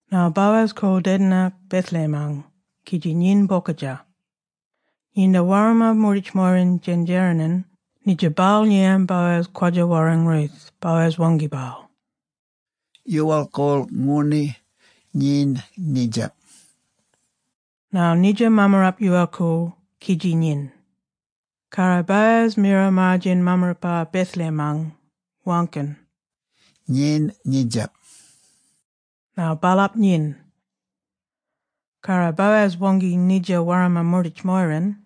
Ngarl Boaz koorl dedinak Bethlehem-ang kidji nyin bokadja. Nginda warmma moorditj-moyiran djendjereniny, nidja baal ngiyan Boaz kwadja-warrang Ruth, Boaz waangki baal, “Yoowal-koorl ngooni, nyin nidjap”. Ngarl nidja mammarap yoowal-koorl kidji nyin. Karro Boaz mira maar-djen mammarapa Bethlehem-ang, waangkiny, “Nyin nidjap.” Ngarl baalap nyin. Karro Boaz waangki nidja warmma moorditj-moyiran,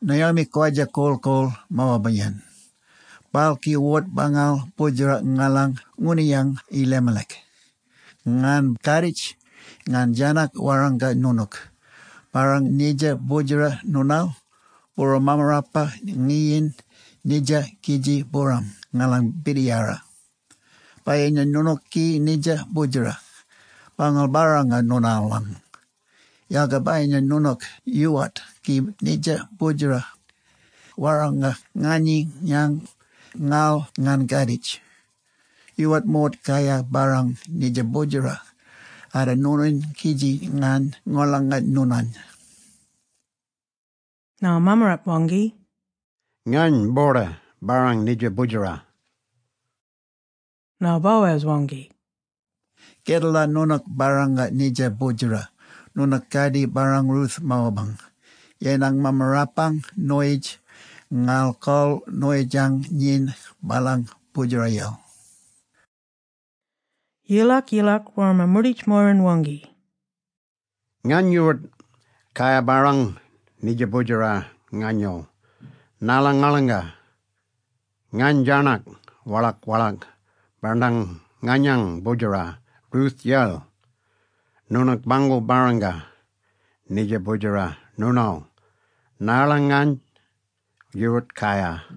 “Naomi kwadja korl-koorl Moaba-yen. Baal ki wort-bangal boodjera ngalang ngooniyang Elimelech. Ngany kaaditj ngany djarnak warranga noonook, ‘Barrang nidja boodjera noonaal, booram mammarapa nyininy nidjap kidji booram ngalang birdiyara.’ Bayinya noonook ki nidja boodjera, bangal-barranga noonaalang. Yalga bayinya noonook yoowart ki nidja boodjera, warranga nganyany, ngarl ngany kaaditj. Yoowart moort kayar barrang nidja boodjera, arda noonany, kidji ngany ngolonga noonany.” Ngarl mammarap waangki, “Ngany boorda barrang nidja boodjera.” Ngarl Boaz waangki, “Kedala noonook barranga nidja boodjera, noonook kardjir barrang Ruth Moabang, yenang mammarapang noyitj, ngarl kol noyitjang nyin baalang boodjerayel.” Yilak-yilak, warmma moorditj-moyiran waangki, “Ngany yoowart kayar barrang nidja boodjera nganyaal, narla ngolonga ngany djarnyak walak-walak bandang naganyang boodjera Ruth-yel. Noonook bangal-barranga nidja boodjera noonaal, narla ngany yoowart kayar.”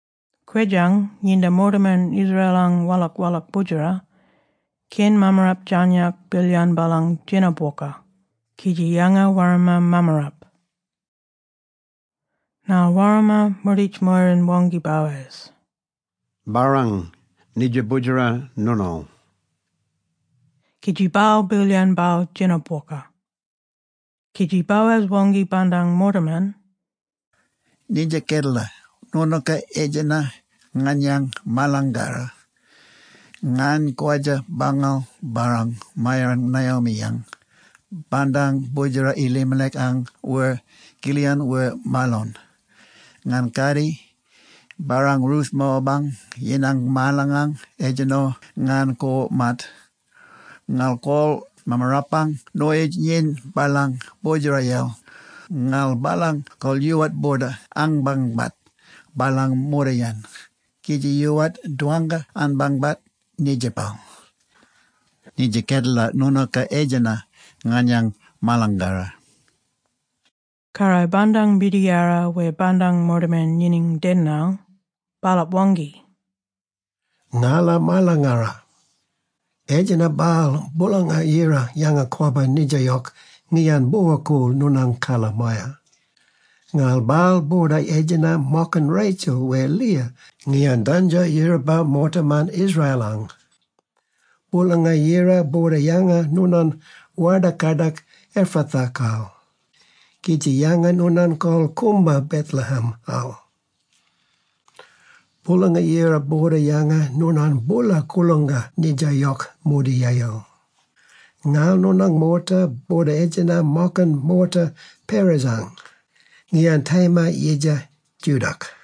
Kwedjang, nginda moortaman Israel-ang walak-walak boodjera, keny mammarap djarnyak bilyan baalang djena-bwoka kidji yanga warmma mammarap. Ngarl warmma moorditj-moyiran waangki Boaz, “Barrang nidja boodjera noonaal!”, kidji baal bilyan baal djena-bwokal. Kidji Boaz waangki bandang moortaman, “Nidja kedala, noonooka etjenna nganyang marlangara. Ngany kwadja bangal-barrang maarayen Naomi-yang, bandang boodjera Elimelech-ang wer Chilion wer Mahlon. Ngany kardjir barrang Ruth Moabang, yinang Mahlon-ang, etjenno ngany koort-maat, ngarl kol mammarapang noyitj nyin baalang boodjerayel, ngarl baalang kol yoowart boorda anbangbat baalang moortayen kidji yoowart dwangka-anbangbat nidjapal. Nidja kedala noonooka etjenna nganyang marlangara.” Karro bandang birdiyara wer bandang moortaman nyininy dedinal, baalap waangki, “Ngala marlangara. Etjenna-bal Boolanga-Yira yanga-kwabba nidja yok ngiyan bwora-koorl noonang karla-maya, ngarl baal boorda etjenna mokiny Rachel wer Leah, ngiyan dandjo yiraba moortaman Israel-ang. Boolanga-Yira boorda yanga noonany warda-kadak Ephrathah-kal kidji yanga noonany kol koomba Bethlehem-al. Boolanga-Yira boorda yanga noonany boola koolangka nidja yok mordiyayel, ngarl noonang moorta boorda etjenna mokiny moorta Perez-ang, ngiyan Tamar yidja Judah-ak.”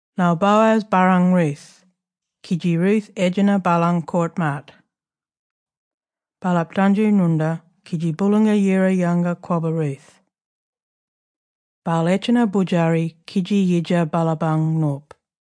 Ngarl, Boaz barrang Ruth kidji Ruth etjenna baalang koort-maat. Baalap dandjo ngwoornda kidji Boolanga-Yira yanga-kwabba Ruth. Baal etjenna boodjari kidji yidja baalapang nop.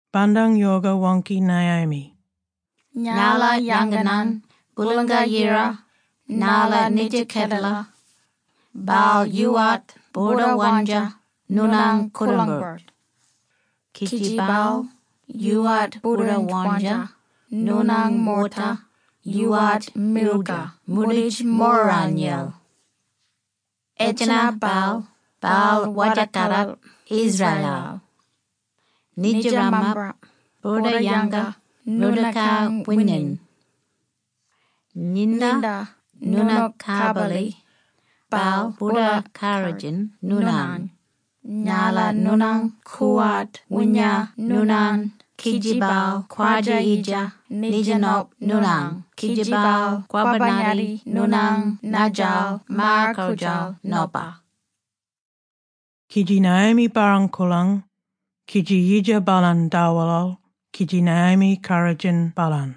Bandang yoka waangki Naomi, “Ngala yanganan Boolanga-Yira narla nidja kedela, baal yoowart boorda wandja noonany koolang-birt, kidji baal boorda yoowart wandja noonang moorta yoowart milgar moorditj-moyiranyel. Etjenna-bal baal warda-kadak Israel-al. Nidja mammarap boorda yanga noonookang wininy. Nginda noonook kabarli, baal boorda karrodjin noonany, narla noonang koowart woonya noonany kidji baal kwadja-yidja nidja nop noonang kidji baal kwabba-ngatti noonang naadjal maar-koodjal nopa.” Kidji Naomi barrang koolang kidji yidja baalany dawelal kidji Naomi karrodjin baalany.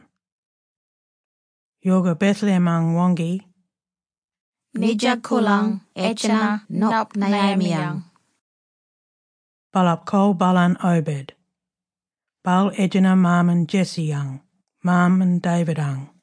Yoka Bethlehem-ang waangki, “Nidja koorlang etjenna nop Naomi-yang.” Baalap kol baalany Obed. Baal etjenna maaman Jesse-yang, maaman David-ang.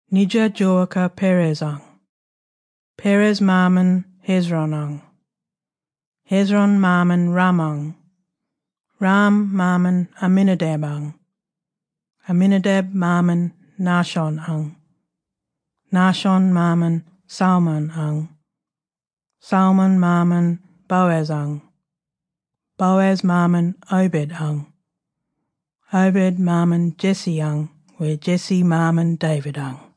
Nidja djoowaka Perez-ang: Perez maaman Hezron-ang; Hezron maaman Ram-ang; Ram maaman Amminadab-ang; Amminadab maaman Nahshon-ang; Nahshon maaman Salmon-ang; Salmon maaman Boaz-ang; Boaz maaman Obed-ang; Obed maaman Jesse-ang, wer Jesse maaman David-ang.